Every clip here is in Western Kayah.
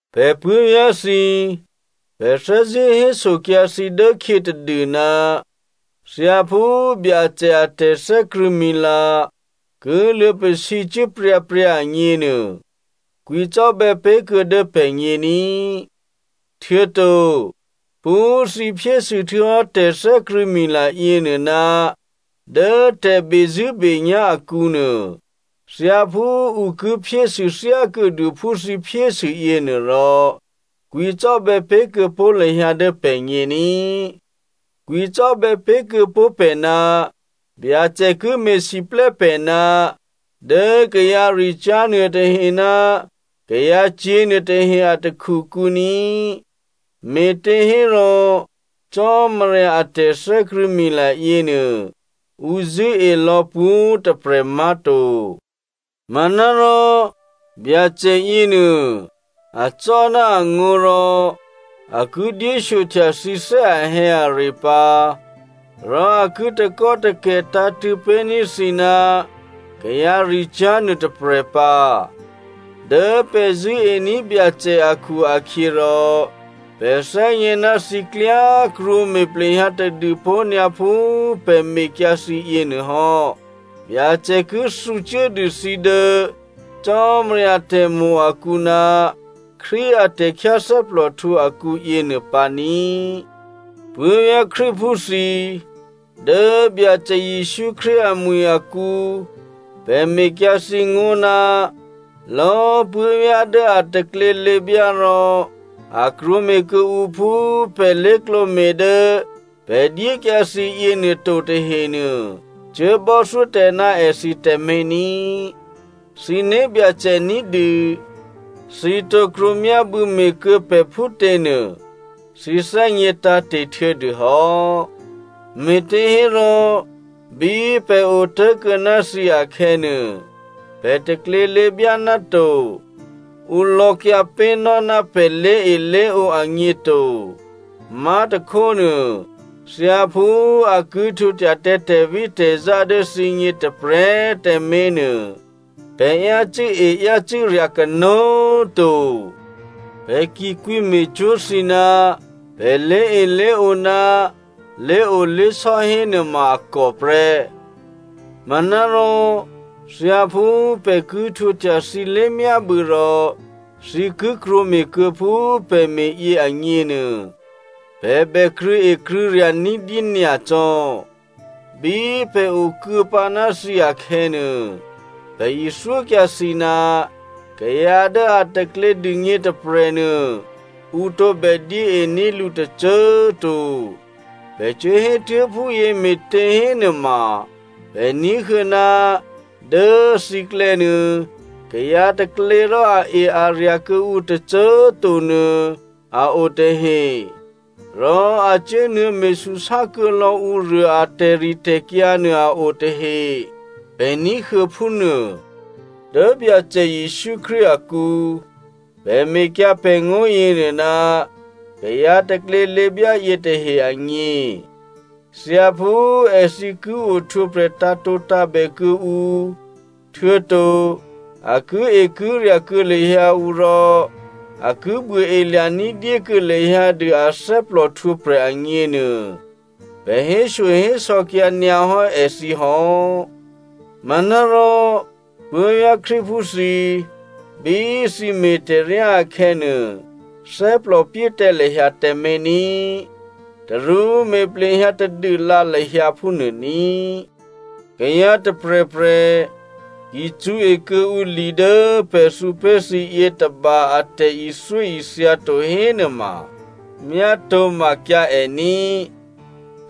Pè̤ puố̤vyá̤ thǐ꤮, pè̤ thè́zṳ̂́ hésokyǎ thǐ dố khyě tadû, thyáphú Byacè a tè̤thè́krṳ̂̌mila ki luô̌pasǐcuố pryǎpryǎ agněnuô, kwǐcò́bè̌ pé̤ kuô̌ dố pè̤gně ní꤮. Htuô̌to phú thǐ phyésû htuô̌hò́ tè̤thè́krṳ̂̌mila yěnuô ná dố tè̤bezṳ̂́benyá̤ akǔnuô thyáphú ǔ ki phyésû thyákuô̌dû phú thǐ phyésû yěnuôrò, kwǐcò́bè̌ pé̤ kuô̌ pó̤ lahyǎ dố pè̤gně ní꤮. Kwǐcò́bè̌ pé̤kuô̌ pó̤ pè̤ ná Byacè ki me̤siplè́ pè̤ ná dố kayǎricyá̤ nuôtahe ná kayǎcyě̤ nuôtahe a takhukǔ ní꤮. Me̤těhérò Cò́marya a tè̤thè́krṳ̂̌mila yěnuô ǔ zṳ̂́e lò̌ pwǒ̤꤮ tôprè̤ má̤to. Manárò Byacè yěnuô acò́ ná angó̤ rò a ki dyéshyohtya thǐ thè́ ahè̌are pǎ, rò a ki takò́takè̤ tǎ̤tṳ̂̌ pé̤ní̤ thǐ ná kayǎricyá̤ nuôtôprè̤ pǎ. Dố pè̤ zṳ̂́ení̤ Byacè akhu-akhyěrò, pè̤ thè́gně ná thǐ klyá꤮ krwǒme̤ plehyǎ tadû pó̤ nyǎ phú pè̤ mekyǎ thǐ yěnuô hò́. Byacè ki thǔcuố dû thǐ dố Cò́marya tè̤mo̤ akǔ ná Krístu a tè̤khyáthè́plòhtǔ akǔ yěnuô pǎ ní꤮. Puố̤vyá̤ Krístuphú thǐ꤮, dố Byacè Jesǔ Krístu amwi̤ akǔ, pè̤ mekyǎ thǐ ngó̤, lò̌꤮ puố̤vyá̤ dố a taklělěbyá rò a krwǒme̤ kuô̌ǔ phú pè̤ lé̤klǒme̤ dố pè̤ dyékyǎ thǐ yěnuô to tahenuô cuố bò́thyó tǎ ná èthǐ tǎmé̤ ní꤮. Thǐ né̤byacè ní̤dû thǐ tǒ krwǒmyábû̌ me̤kuô̌ pè̤ phútěnuô thǐ thè́gně tǎ̤te̤ htuô̌dûhò́. Me̤těhérò bí pè̤ otố̤kuô̌ ná thǐ akhè̌nuô, pè̤ taklělěbyá ná to. Ǔ lò̌kyǎ pé̤nò́ ná pè̤ lé̤elé̤ǒ agně to. Má̤tôkhónuô, thyáphú a ki htwǒhtya tǎ tè̤vítè̤zá dố thǐgně tôprè̤꤮ tǎmé̤ nuô, pè̤ yácû́e yácû́rya̤ kanó̤꤮ to. Pè̤ ki kwǐme̤cwó̤ thǐ ná pè̤ lé̤elé̤ǒ ná lé̤olé̤sò́ hénuôma a kò prè́. Manárò thyáphú pè̤ ki htwǒhtya thǐ lé̤myábû̌ rò thǐ ki krwǒme̤kuô̌ phú pè̤ me̤yě agněnuô, pè̤ bè krṳ̂̌ekrṳ̂̌rya̤ ní̤dyé nyacò́. Bí pè̤ okuô̌pǎ ná thǐ akhè̌nuô, pè̤ ithyókyǎ thǐ, “Kayǎ dố a taklě dûgně tôprè̤nuô, ǔ tǒbè dyéení̤ lǔ tôcô꤮ to.” Pè̤ cuốhétuố̤ phúyě me̤těhénuôma, pè̤ ní̤huô̌ ná dố thǐklè̌nuô kayǎ taklě rò ae-arya̤ kuô̌ǔ tôcô꤮ to nuô a o tahe. Rò a cuốnuô̌ me̤súsá kuô̌lò̌ ǔruô a tè̤ritè̤kyǎ nuô a o tahe, pè̤ ní̤huô̌ phúnuô. Dố Byacè Jesǔ Krístu akǔ, pè̤ mekyǎ pè̤ngó̤ yěnuô ná kayǎ taklělěbyá yětahe agně. Thyáphú èthǐ ki ohtwǒprè̤ tǎ̤tǒtǎ̤bè kuô̌ǔ, htuô̌to a kiekirya̤ kuô̌ lahyǎ ǔ rò a ki buôelya̤ní̤ dyékuô̌ lahyǎ dû a thè́plòhtwǒprè̤ agněnuô, pè̤ héshyohésò̌kyǎ nyǎ hò́ èthǐ hò́. Manárò, puố̤vyá̤ Krístuphú thǐ꤮, bí thǐ me̤ tè̤ryá akhè̌nuô, thè́plòpyé tǎ lahyǎ tǎmé̤ ní꤮. Tarú me̤ plehyǎ tadûlǎ lahyǎ phúnuô ní꤮. Kayǎ tôprè̤prè̤ ki cṳ̌e kuô̌ǔ li dố pè̤ thǔpé̤ thǐ yětôba a tè̤ithyóithya to hénuôma myátǒmakyǎ è ní꤮.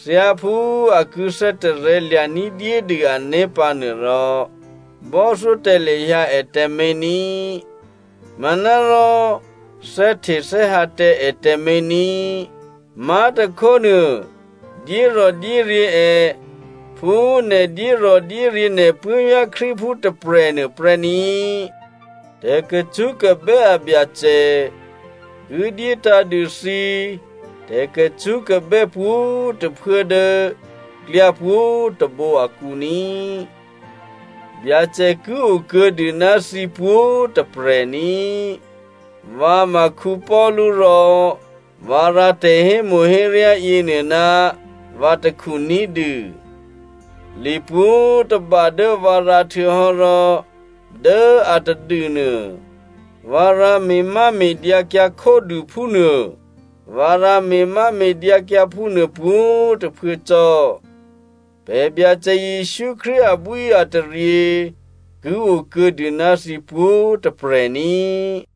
Thyáphú a ki thè́tarè̤̌ lya̤ ní̤dyédû ané̤ pǎnuô rò, bò́thyó tǎ lahyǎ è tǎmé̤ ní꤮. Manárò thè́htethè́hǎ tǎ è tǎmé̤ ní꤮, má̤tôkhónuô dyérò̤dyéryě̤ è phú nè̤ dyérò̤dyéryě̤ nè̤ puố̤vyá̤ Krístuphú tôprè̤nuô prè́ ní꤮. Tè̤kacṳ́kabè́ a Byacè ki dyétǎ̤ dû thǐ tè̤kacṳ́kabè́ pwǒ̤꤮ tôphuố dố klyá pwǒ̤꤮ tôbǒ akǔ ní꤮. Byacè ki okuô̌ dû ná thǐ pwǒ̤꤮ tôprè̤ ní꤮. Vǎ ma Paulu rò vǎ rǎ tè̤hémo̤héryá yěnuô ná vǎ takhu ní̤dû. Li pwǒ̤꤮ tôba dố vǎ rǎ htuô̌hò́ rò dố atadû nuô, vǎ rǎ me̤máme̤dyǎkyǎ khódû phúnuô. Vǎ rǎ me̤máme̤dyǎkyǎ phúnuô pwǒ̤꤮ tôphuố cò́. Pè̤ Byacè Jesǔ Krístu abwíataryě ki o kuô̌dû ná thǐ pwǒ̤꤮ tôprè̤ ní꤮.